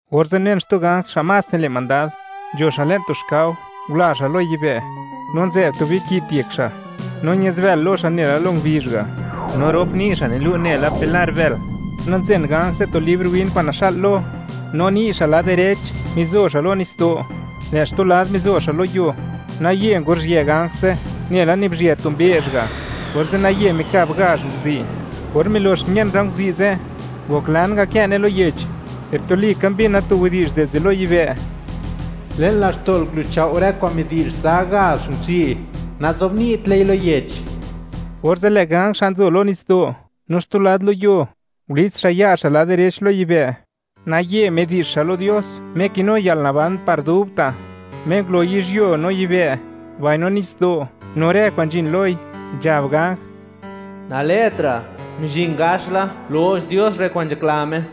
Orze' unen xtu ganj xa' más nile' mandad, nzho xa' le'n tu xkao, ngula xa' lo yibë', nu nzë'b tu biki't yek xa'; no ña'zbël lo xa' nela lo ngubizh ga', no rop ni' xa' nilu' nela pilar bël. No nzen ganj ze' tu libr win kwa'n naxa'l lo, no ni' xa' lad direch mizo xa' lo nitsdo', lë' xtu lad mizo xa' lo yuo, naye nguruzhië ganj ze' nela nibizhyë tu mbe'zh ga', orze' naye mikab gazh nguzi'. Or milox mien rë nguzi' ze', ngoklan ngakë'ne lo yech, per tuli ka mbina tu widi'zh dizde lo yibë': ―Le'n laxto'l guluchao' rë kwa'n midi'zh za gazh nguzi', nazobni'tle lo yech. Orze', lë' ganj xa' nzo ni' lo nitsdo' no xtu lad lo yuo, ngulits xa' ya' xa' lad direch lo yibë', naye midi'zh xa' lo Dios Me kinu yalnaban par dubta', Me ngulo yizhyuo no yibë', mbaino nitsdo', no rë kwa'n nzhin loi, nzhab ganj: ―Nalë'tra'; mizhin gax la lo'x Dios rë kwa'n nzhakla Me,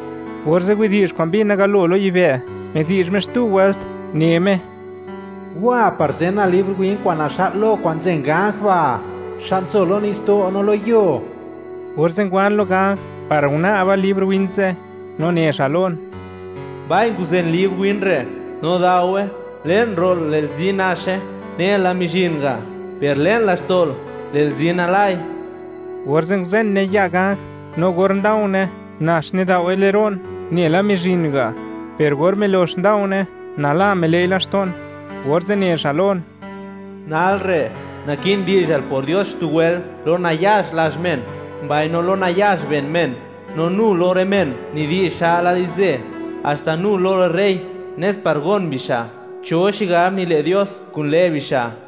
Orze' widi'zh kwa'n mbina galo lo yibë', midi'zh Me xtu wëlt, ne Me: ―Wa par zenal libr win kwa'n naxa'l lo, kwa'n nzen ganj ba', xa' nzo lo nitsdo' no lo yuo. Orze' ngwan lo ganj par una'ba libr win ze', no ne xa' lon: ―Mbai; guzen libr win re' no gudaowe. Le'n ro'l, lë'l zi naxe nela mizhin ga'; per le'n laxto'l, lë'l zi nalai. Orze', nguzenne ya' ganj, no or nda̱u̱ne̱, nax nidao'we le'n ro'n nela mizhin ga'; per or milox nda̱u̱ne̱, nala mile'i laxto'n, orze' ne xa' lon: ―Nal re', naki'n di'zhal por Dios xtu wëlt lo nayax lazh men, mbaino lo nayax ben men, no nu lo rë men nidi'zh xa'la di'zhzë, haxta nu lo rë rey, nes par gon bixa' cho xigab nile' Dios kun lë' bixa'.